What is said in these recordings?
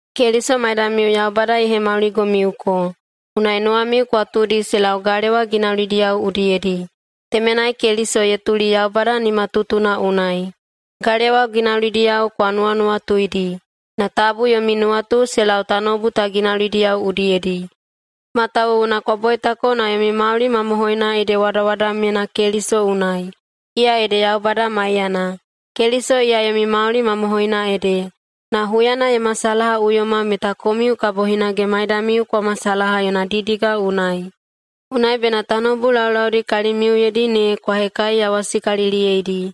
Keliso maidamiu Yaubada ye hemauligomiuko. Unai nuwamiu kwa tuudi se lau galewa ginaulidiyao udiyedi. Temenai Keliso ye tuli Yaubada nimatutuna unai. Galewa ginaulidiyao kwa nuwanuwatuidi, na tabu yomi nuwatu se lau tanoubu ta ginaulidiyao udiyedi, matawuwuna kwa boitako na yomi mauli mamohoina ede wadawadamyena Keliso unai, iya ede Yaubada maiyana. Keliso iya yomi mauli mamohoina ede, na huyana ye masalahaꞌuyoma meta komiu kabo hinage maidamiu kwa masalaha yona didiga unai. Unai bena tanoubu laulaudi kalimiuyedi ne kwa hekaiyawasikaliliyeidi,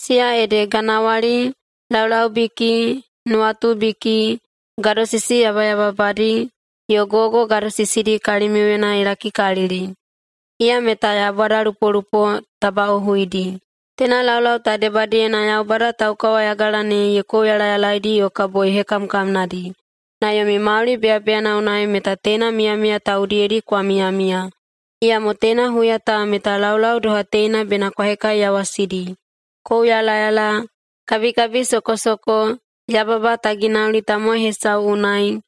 siya ede: ganawali, laulaubiki, nuwatubiki, gadosisi yabayababadi, yo gogo gadosisidi kalimiuyena ye lakikalili, iya meta yaubadalupolupo tabaꞌohuidi. Teina laulau ta debadiyena Yaubada taukawayagala ne ye kouyalayalaedi yo kabo ye hekamkamnadi, na yomi mauli beyabeyana unai meta teina miyamiya ta udiyedi kwa miyamiya. Iyamo teina huya ta meta laulau doha teina bena kwa hekaiyawasidi: kouyalayala, kabikabisokosoko, yababa ta ginauli tamowai hesau unai,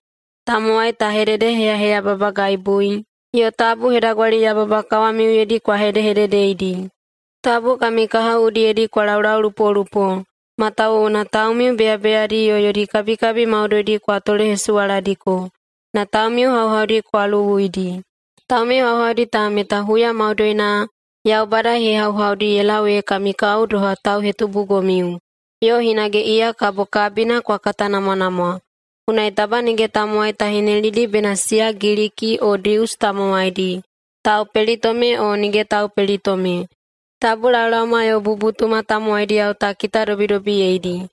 tamowai ta hededeheyaheyababagaibui, yo tabu hedagwaliyababa kawamiuyedi kwa hedehededeidi. Tabu kami kahao udiyedi kwa laulaulupolupo, matawuwuna taumiu beyabeyadi yo yodi kabikabi maudoidi kwa tolehesuwaladiko, na taumiu hauhaudi kwa luwuidi. Taumiu hauhaudi ta meta huya maudoina Yaubada ye hehauhaudi ye lau ee kami kao doha tauhetubugomiu, yo hinage iya kabo kabina kwa katanamwanamwa. Unai taba nige tamowai ta hinelidi bena siya Giliki o Dius tamowaidi, taupelitome o nige taupelitome. Tabu laolaoma yo bubutuma tamowaidi ta kitadobidobiyeidi.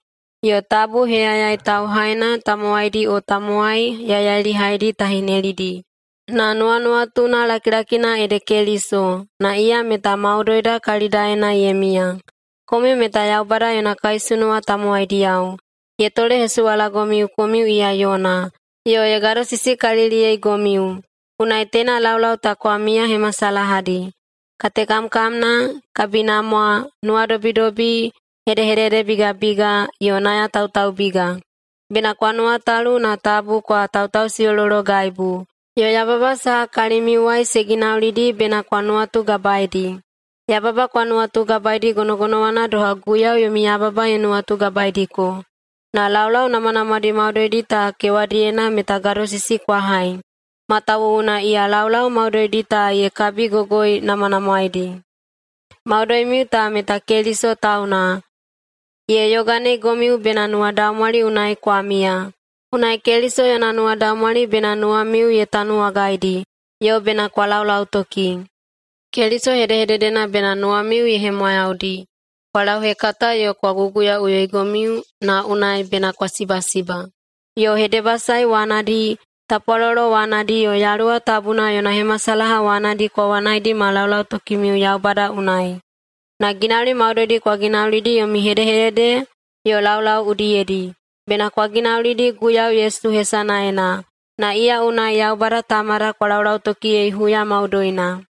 Yo tabu heyayai tauhaina tamowaidi o tamowai yaiyailihaidi ta hinelidi. Na nuwanuwatuna lakilakina ede Keliso, na iya meta maudoida kalidaena ye miya. Komiu meta Yaubada yona kaisunuwa tamowaidiyao, ye tolehesuwalagomiu komiu iya yona, yo ye gadosisikaliliyeigomiu. Unai teina laulau ta kwa miyahemasalahadi: Katekamkamna, kabinamwa, nuwadobidobi, hedehededebigabiga, yo nayatautaubiga. Bena kwa nuwatalu na tabu kwa tautausiꞌolologaibu, yo yababa saha kalimiuwai se ginaulidi bena kwa nuwatugabaedi. Yababa kwa nuwatugabaedi gonogonowana doha Guiyau yomi yababa ye nuwatugabaediko. Na laulau namwanamwadi maudoidi ta kewadiyena meta gadosisi kwa hai. Matawuwuna iya laulau maudoidi ta ye kabigogoinamwanamwaedi. Maudoimiu ta meta Keliso tauna. Ye yoganeigomiu bena nuwadaumwali unai kwa miya. Unai Keliso yona nuwadaumwali bena nuwamiu ye tanuwagaidi, yo bena kwa laulautoki. Keliso hedehededena bena nuwamiu ye hemwayaudi. Kwa lauhekata yo kwa guguyaꞌuyoigomiu, na unai bena kwa sibasiba. Yo hedebasae wanadi, tapwalolo wanadi, yo Yaluwa Tabuna yona hemasalaha wanadi kwa wanaidi ma laulautokimiu Yaubada unai. Na ginauli maudoidi kwa ginaulidi yomi hedehedede yo laulau udiyedi, bena kwa ginaulidi Guiyau Yesu hesanaena, na iya unai Yaubada Tamada kwa laulautokiyei huya maudoina.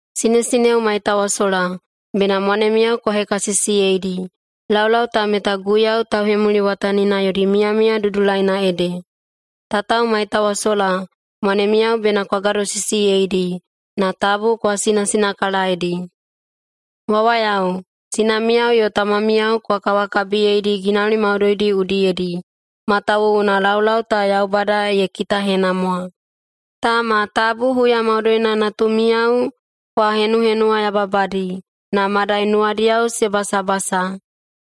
Sinesineo maitawasola, bena mwanemiyao kwa hekasisiyeidi. Laulau ta meta Guiyau tauhemuliwatanina yodi miyamiya dudulaina ede. Tatao maitawasola, mwanemiyao bena kwa gadosisiyeidi, na tabu kwa sinasinakalaedi. Wawayao, sinamiyao yo tamamiyao kwa kawakabiyeidi ginauli maudoidi udiyedi, matawuwuna laulau ta Yaubada ye kitahenamwa. Tama, tabu huya maudoina natumiyao kwa henuhenuwayababadi, na madai nuwadiyao se basabasa.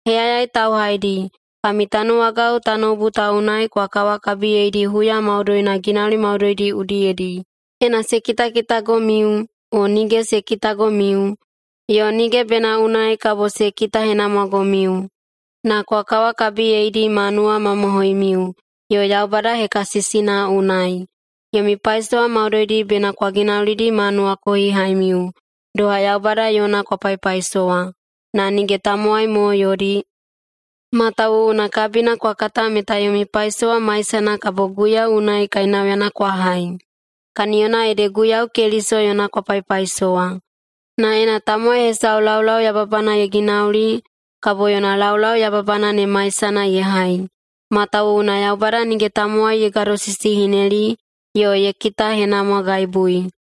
Heyayai tauhaidi, kami tanuwagao tanoubu ta unai kwa kawakabiyeidi huya maudoina ginauli maudoidi udiyedi, ena se kitakitagomiu o nige se kitagomiu, yo nige bena unai kabo se kitahenamwagomiu. Na kwa kawakabiyeidi ma nuwamamohoimiu yo Yaubada hekasisina unai. Yomi paisowa maudoidi bena kwa ginaulidi ma nuwakohihaimiu, doha Yaubada yona kwa paipaisowa, na nige tamowai mo yodi, matawuwuna kabina kwa kata meta yomi paisowa maisana kabo Guiyau unai kainauyana kwa hai. Kaniyona ede Guiyau Keliso yona kwa paipaisowa. Na ena tamowai hesau laulau yababana ye ginauli kabo yona laulau yababana ne maisana ye hai, matawuwuna Yaubada nige tamowai ye gadosisihineli yo ye kitahenamwagaibui.